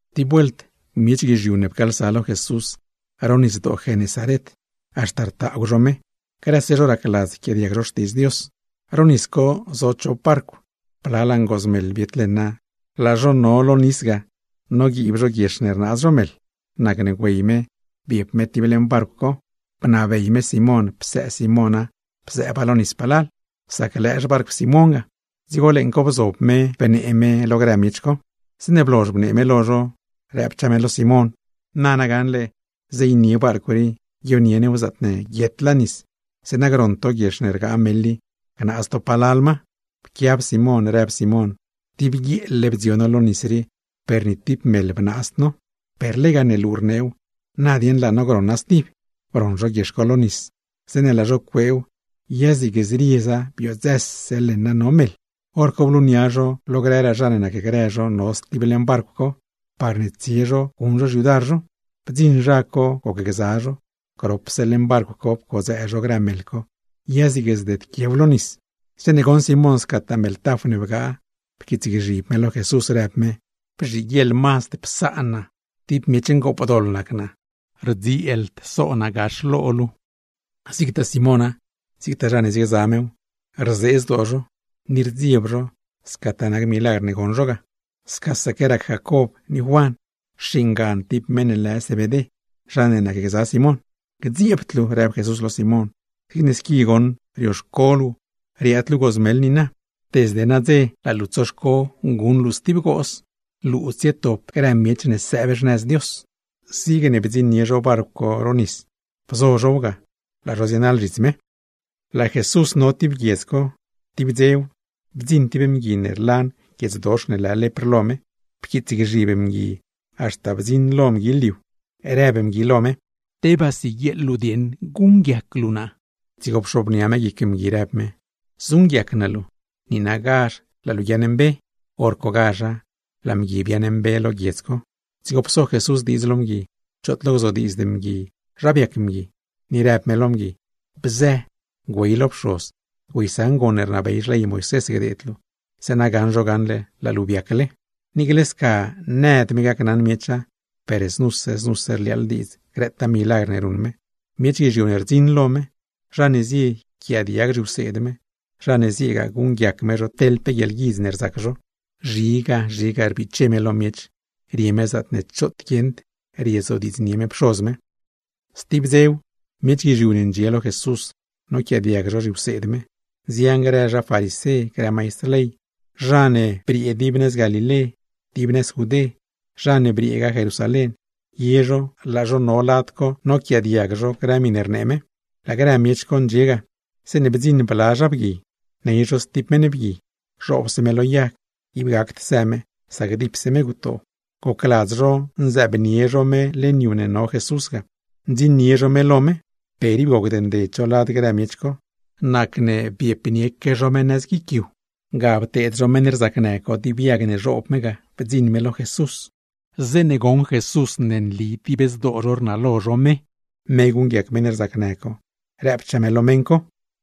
Tib vuelt miech guizhiu ne pcaalsa lo Jesús ro Nisdoo Genesaret, haxta rtaagw zho me; grëse zho racladz yquiaadiag zho Xtiidz Dios. Gax ga zo chop barcw, blalaa ngooz meḻ biet leṉa, laa zho no lo nis ga noguiib zho guiex ne rnaaz zho meḻ. Nacne güey me biep me tib leṉ barcw co, bnabey me Simón psëë Simóna bzëëba lo nis palal; sac lëë xbarcw Simón ga. Dzigo leeṉ co bzob me pseed me grë miech co. Zeeṉe blozh bnee me lo zho, rëbchaa me lo Simón: ―Nana gaṉle zeeynie barcw rii guionie new zaatne guietlaa nis, zeeṉa groṉ to guiex ne rgaa meḻ i gnaaz to palal ma. Pquiab Simón rëb Simón: ―Dib guieel-le bdzio no lo nis rii, per ni tib meḻ bnaazd no; per lega ne luu rneew, na dieṉ laa no groṉa stib. Broṉ zho guiex co lo nis, zeeṉe laa zho cueew, ya zig zrieza, biodzëse leṉa no meḻ. Horco blunia zho lo grëraa zha ne nacgrë zho no stib leṉ barcw co, parne tsie zho guṉ zho xyudar zho. Bdziṉ zha co gocgza zho, gropse leṉ barcw co pcodzëë zho grë meḻ co; ya zig zdedquiew lo nis. Zeeṉe goṉ Simón scataa meḻ taf ne bgaa, pquiitsgzhib me lo Jesús, rëb me: ―Bzhiguieḻ mazd psaan naa, tib miech ngoopdoḻ nac naa, rdzieeld so luu lo naa nu. Zigtaa Simóna, zigtaa zha ne ziegza mew, rzee zdoo zho ni rdzieb zho scataa nac milagr ne goṉ zho ga. Scasaque rac Jacob ni Juan (xingan tib meṉ lë Zebedé), zha ne nacgza Simón. ―Gdzieebd luu ―rëb Jesús lo Simón―. Zigne squi goṉ rioxco luu riaad luu gooz meḻ niina, desde nadze laa luu tsoxco guṉ luu stib gooz; laa naa cxeḻ luu tsietop luu grë miech ne sëëb xnëz Dios. Zigne bdziṉnie zho barcw co ro nis, bzo zhow ga, laa zho zienaḻ zhits me. Laa Jesús no tib guiedz co, tib dzew, bdziṉ tib mgui ne rlan guiedzdox ne lë lepr lo me, pquiitsgzhib mgui haxta bdziṉ lo mgui liu, rëb mgui lo me: ―Tebaa siguieeḻ luu guṉguiac luu naa. Dzigo pxobnia me guic mgui, rëb me: ―Zuṉguiac naa luu. ¡Niinagazh laa luu guiaaṉmbe! Horcogazha laa mgui biaaṉmbe lo guiedz co. Dzigo pso Jesús diidz lo mgui, choot lo gzodiidzd mgui zha biac mgui; ni rëb me lo mgui: ―Bzë, güey lo pxoz, güeysaṉ gon ne rnabey xley Moisés gdeed luu; zeeṉa gaṉ zho gaṉle laa luu biacle. Niicle sca nëd me gacnaṉ miecha, per znuse znuse rliaaḻ diidz grëtaa milagr ne ruṉ me; miech guizhiu ne rdziṉ lo me, zha ne zie yquiaadiag zhiwseed me, zha ne zieegaa guṉguiac me zho teḻ pe guieḻguidz ne rzac zho. Zhiga, zhiga rbiche me lo miech, rie me zaatne choot guieṉd riezodiidznie me Pxoz me. Stib dzew, miech guizhiu ne ndxie lo Jesús noquiaadiag zho zhiwseed me. Nzian grë zha farisé, grë maistr ley, zha ne briee dib nëz Galilé, dib nëz Judé, zha ne brieegaa Jerusalén, ye zho laa zho no lad co noquiaadiag zho grë miṉe rnee me. Laa grë miech co ndxie ga, zeeṉe bdziṉ bla zha bgui, ney zho stib meṉ bgui, zhoobse me lo yag, ib gacd së me sac dipse me gutoo. Gocladz zho nzëëbnie zho me leṉ yu ne no Jesús ga, ndziṉnie zho me lo me. Per ib gocd nded zho lad grë miech co. Nacne biepaque zho guic yu, pxal zho tiblë guiic co, ga pteed zho meṉ rzacnë co dib yag ne zhoob me ga, bdziṉ me lo Jesús. Zeeṉe goṉ Jesús ne nli dib zdoo zho rnalo zho me, me guṉguiac meṉ rzacnë co, rëbchaa me lo meṉ co: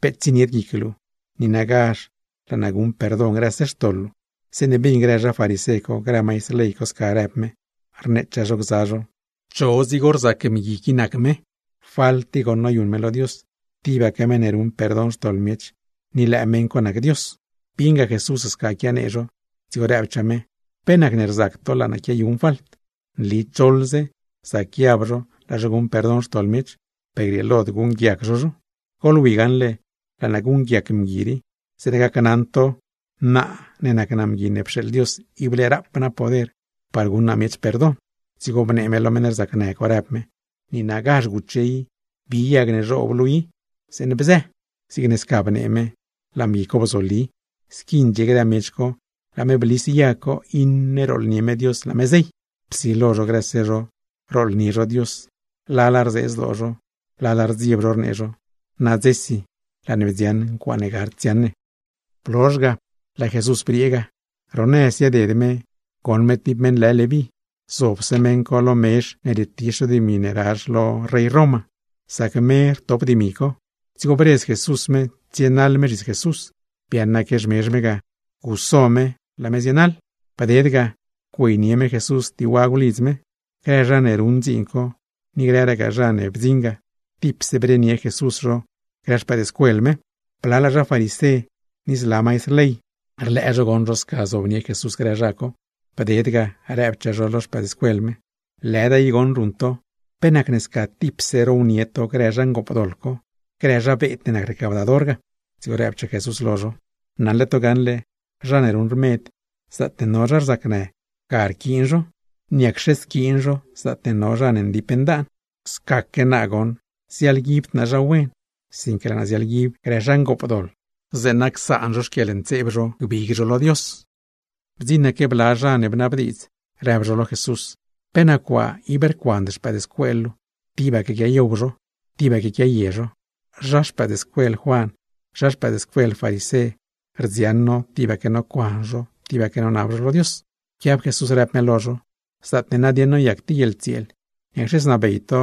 ―Peet tsienied guic luu, niinagazh laa naa guṉ perdon grëse xtoḻ luu. Zeeṉe bin grë zha farisé co, grë maistr ley co sca rëb me, rneechaa zho gza zho: “¿Cho dzigo rzac mgui qui nac me? ¡Falt i goṉ noyuṉ me lo Dios! ¡Tibaque meṉ ne ruṉ perdon xtoḻ miech, ni lëë meṉ co nac Dios!” Bieṉga Jesús sca quianee zho, dzigo rëbchaa me: ―¿Pe nacne rzac to laa naa quiayuṉ falt? Nli choḻze zac guiab laa zho guṉ perdon xtoḻ miech, per grieelod guṉguiac zho zho. Goḻwi gaṉle laa naa guṉguiac mgui rii, zeeṉa gacnaṉ to naa ne nac naa Mgui ne pxeeḻ Dios, ible rap naa poder par guṉ naa miech perdon. Dzigo bnee me lo meṉ rzacnë co, rëb me: ―¡Niinagazh guche i, bi yag ne bzhoob luu i, zeeṉ bzë! Zigne sca bnee me, laa mgui co bzoli, squi ndxie grë miech co laa me blis yag co, iṉe rooḻnie me Dios laa me zey. Psilo zho grëse zho, rooḻnie zho Dios; lala rzee zdoo zho, lala rdzieb zho, rnee zho: ―¡Nadzesi, laa ne bdziaṉ ncuaaṉe gard dziaṉ ne! Blozh ga, laa Jesús briee ga. Ro nëz zieded me goṉ me tib meṉ lë Leví, zobse meṉ co lo mezh ne rietizh zho dimi ne razh lo zha Roma, sac me rtop dimi co. Dzigo bredz Jesús me tsienaḻ me zhits Jesús. Biaaṉaque xmezh me ga, guso me ga, laa me zienaḻ. Bded ga, güeynie me Jesús tib wagw lidz me. Grë zha ne ruṉ dziin co, ni grëragaa zha ne bdziṉ ga, tipse brenie Jesús zho grë xpëëdscuel me. Blalaa zha farisé, ni zla maistr ley, rlëë zho goṉ zho sca zobnie Jesús grë zha co, bded ga rëbchaa zho lo xpëëdscuel me: ―¡Lëda i goṉ ruṉ to! ¿Pe nacne sca tipse rownie to grë zha ngoopdoḻ co, grë zha beed ne nac recaudador ga? Dzigo rëbchaa Jesús lo zho: ―Naṉle to gaṉle, zha ne ruṉ rmed, zaatne no zha rzacnë ga rquiin zho, ¿niacxe squiin zho zaatne no zha ne ndip ndaan? Scaque naa nagoṉ, ziaḻguibd naa zha wen, sinque laa naa ziaḻguib grë zha ngoopdoḻ, zeeṉa gbig zho lo Dios. Bdziṉaque bla zha ne bnabdiidz, rëb zho lo Jesús: ―¿Pe nac waa ib rcuand xpëëdscuel luu, tibaque quiayow zho, tibaque quiaye zho? Zha xpëëdscuel Juan, zha xpëëdscuel farisé, rdziaṉ no tibaque nocuan zho, tibaque nonab zho lo Dios. Pquiab Jesús rëb me lo zho: ―Zaatne nadieṉ noyac tib guieḻtsieel, ¿niacxe znabey to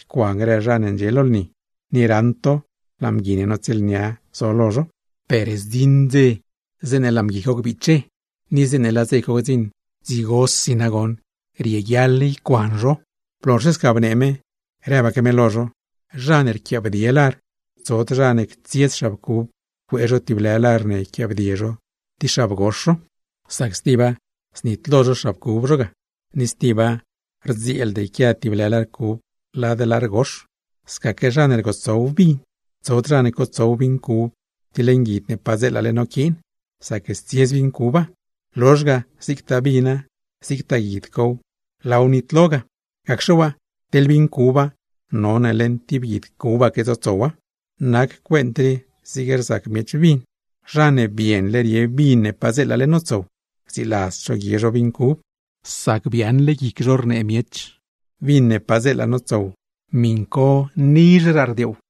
ycuan grë zha ne ndxie lo lni, ni raṉ to laa mgui ne notsieelnia zo lo zho? Per zdziṉ dze zeeṉe laa mgui co gbiche, ni zeeṉe laa dze co gdziṉ, dzigosi nagoṉ rieguiaḻ ycuan zho. Blozhse sca bnee me, rëbaque me lo zho: ―Zha ne rquiaabdie lar, tsod zha ne ctsiez xab cub cuee zho tib lë lar ne yquiaabdie zho tib xab gox zho. Sac tiba, znitlo zho xab cub zho ga, ni stiba rdzieeld yquia tib lë lar cub lad lar gox. Scaque zha ne rgotsow vin, tsod zha ne cotsow vin cub tib leṉ guid ne padzeelale noquiin, sac stsiez vin cuba; lozh ga zigtaa vina, zigtaa guid cow, laaw nitlo ga. Gacxe waa, teḻ vin cuba none leṉ tib guid cubaque tsotsowa. ’Nac cuent rii zig rzac miech vin, zha ne bienle rie vin ne padzeelale notsow, rdziladzd zho guie zho vin cub; sac biaaṉle guic zho rnee miech: “Vin ne padzeela notsow, miṉ co nizhraa rdioow.”